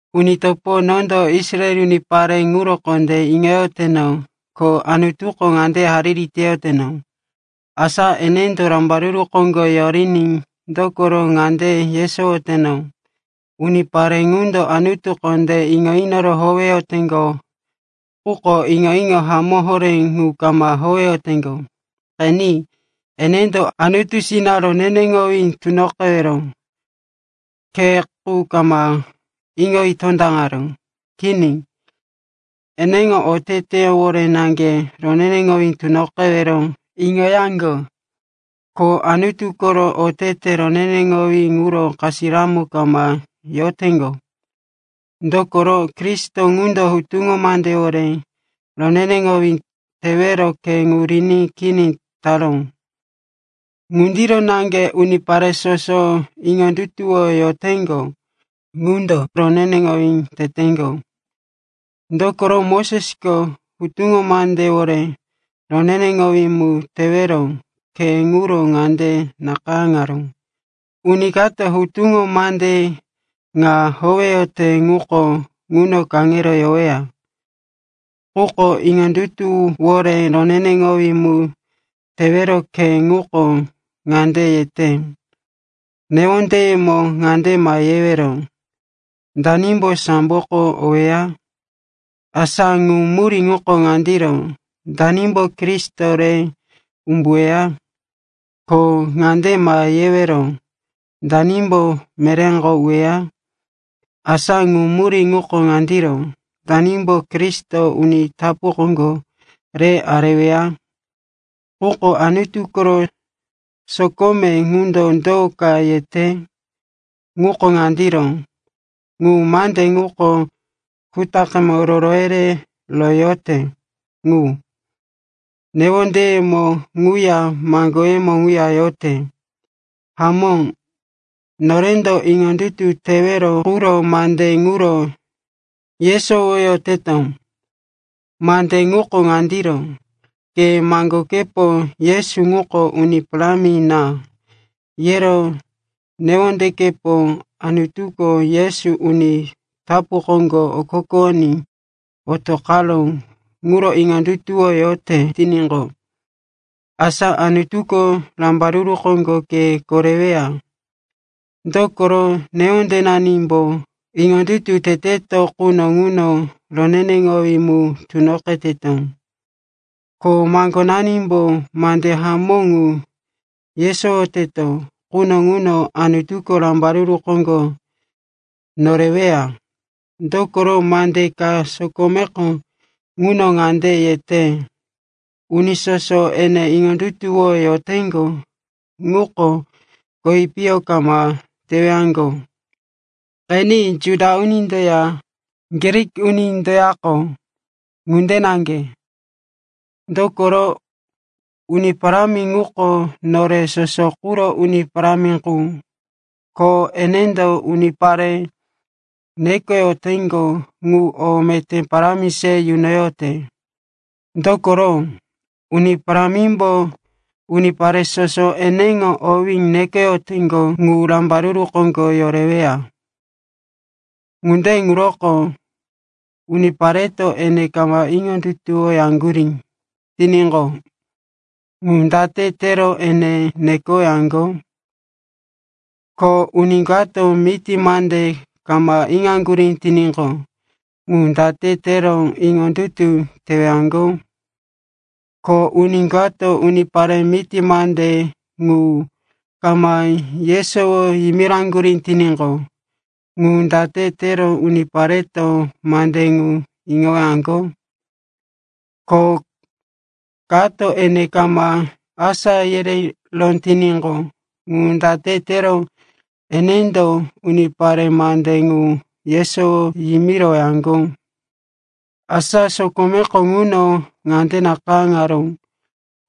Uni topo, nondo Israel unipare ŋuro kondé iŋoyoteno, ko Anutuko ŋande hariri teyoteno, asa enendo rambaruru koŋgo yoriní. Dokoro ŋande yesowoteno, unipare ŋundo Anutu kondé iŋo inoro howeyoteŋgo, quko iŋo-iŋo hamó horé ŋu kama howeyoteŋgo. Qeni, enendo Anutusina roneneŋowí tunoqewero khe qu kama iŋoyi tondaŋaró. Kini, eneŋo oteteyewore naŋge roneneŋowí tunoqewero iŋoyaŋgo. Ko Anutu koro otete roneneŋowí ŋuro kasiramo kama yoteŋgo. Dokoro Kristo ŋundo hutuŋo mandewore roneneŋowí tewero khe ŋu riní kini taró. Ŋundiro naŋge unipare soso iŋondutuwoyoteŋgo ŋundo roneneŋowí teteŋgo. Dokoro Mosesko hutuŋo mandewore roneneŋowí mu tewero khe ŋuro ŋande nakayáŋaró, “Uni kato hutuŋo mande ŋa howeyote ŋuko ŋuno kaŋero yoweya.” Quko iŋondutuwore roneneŋowí mu tewero khe ŋuko ŋande yete, “Newondeyemo ŋande ma yewero, ‘Danimbo samboko oweya?’” (Asa ŋu murí ŋuko ŋandiro, “Danimbo Kristo re umbuweya?”) Ko ŋande ma yewero, “Danimbo meréko uweya?” (Asa ŋu murí ŋuko ŋandiro, “Danimbo Kristo uni tapu koŋgo re areweya?”) Quko Anutu koro sokome ŋundo do ka yete? Ŋuko ŋandiro, “Ŋu mande ŋuko kutaqe roro yerero yote ŋu. Newondeyemo ŋuya maŋgoyemo ŋuya yote.” Hamó, norendo iŋondutu tewero quro mande ŋuro yesowoyoteto. Mande ŋuko ŋandiro: ke maŋgokepo, “Yesu ŋuko Uni Parámi na,” yero newondekepo Anutuko Yesu uni tapu koŋgo okokowoní otoqaró ŋuro iŋondutuwoyote tiníqo, asa Anutuko rambaruru koŋgo ke koreweya. Dokoro newondenanimbo iŋondutu teteto quno ŋuno roneneŋowí mu tunoqeteto. Ko maŋgonanimbo mande hamó ŋu yesowoteto quno ŋuno Anutuko rambaruru koŋgo noreweya. Dokoro mande ka sokomeko ŋuno ŋande yete, “Uni soso ene iŋondutuwoyoteŋgo ŋuko kowi piyo kama tewaŋgo.” Qeni, Juda unindoya Grik unindoyako ŋunde naŋge. Dokoro Uni Parámi ŋuko nore soso quro Uni Parámi qu. Ko enendo unipare nekoyoteŋgo ŋu o meté parámi se yunoyote. Dokoro, “Uni Parámimbo unipare soso eneŋo owí nekoyoteŋgo ŋu rambaruru koŋgo yoreweya.” Ŋunde ŋuroko unipareto ene kama iŋondutuwoyaŋgurí tiníqo, ŋu date tero ene nekowaŋgo? Ko uni kato miti mande kama iŋoyaŋgurí tiníqo, ŋu date tero iŋondutu tewaŋgo? Ko uni kato unipare miti mande ŋu kama yesowo yimiraŋgurí tiníqo, ŋu date tero unipareto mande ŋu iŋowaŋgo? Ko kato ene kama asá yereró tiníqo, ŋu date tero enendo unipare mande ŋu yesowo yimirowaŋgo? Asa sokomeko ŋuno ŋande nakayáŋaró,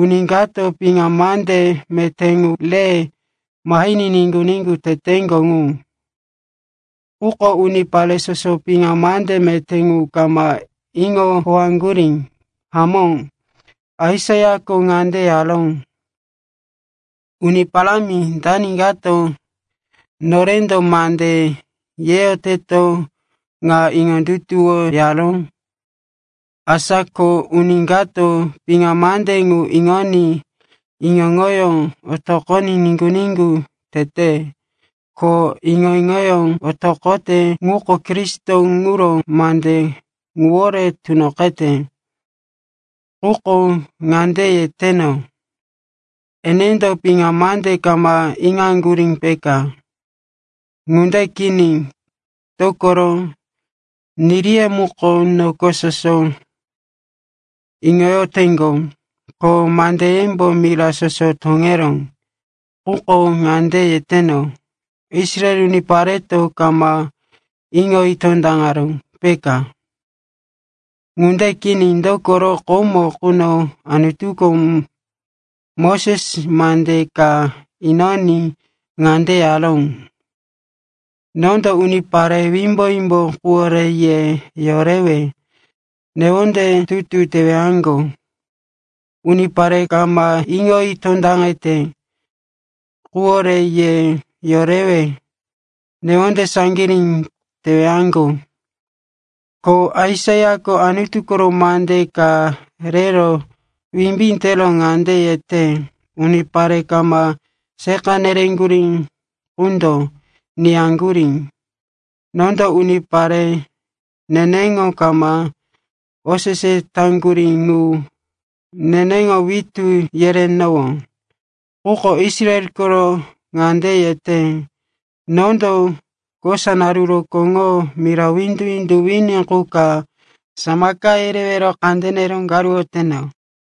“Uni kato piŋa mande meté ŋu re mahiní niŋgu-niŋgu teteŋgo ŋu.” Quko unipare soso piŋa mande meté ŋu kama iŋo howeyaŋgurí. Hamó, Aisaiako ŋande yaró, “Uni Parámi, dani kato norendo mande yeyoteto ŋa iŋondutuwoyaró?” Asa ko, uni kato piŋa mande ŋu iŋoní iŋo-iŋoyó otoqoní iŋondutu tete. Ko iŋo-iŋoyó otoqote ŋuko Kristo ŋuro mande ŋuwore tunoqete. Quko ŋande yeteno, enendo piŋa mande kama iŋaŋgurí, peka? Ŋunde kini, dokoro “Niriye muko noko soso iŋoyoteŋgo, ko mandeyembo mira soso toŋeró.” Quko ŋande yeteno, Israel unipareto kama iŋoyi tondaŋaró, peka? Ŋunde kini, dokoro komo quno Anutuko Moses mande ka inoní ŋande yaró, “Nondo unipare wimbo-wimbo quwore ye yorewe newonde tutu tewaŋgo, unipare kama iŋoyi tondaŋete quwore ye yorewe newonde saŋgirí tewaŋgo.” Ko Aisaiako Anutu koro mande ka rero wimbí tero ŋande yete, “Unipare kama seqa nereŋgurí qundo niyaŋgurí, nondo unipare neneŋo kama osese taŋgurí ŋu neneŋo witú yerenowó.” Quko Israel koro ŋande yete, “Nondo kosa naru rokóŋo mira windu-windu wini qu ka samaka yerewero kandene raŋoyoteno.”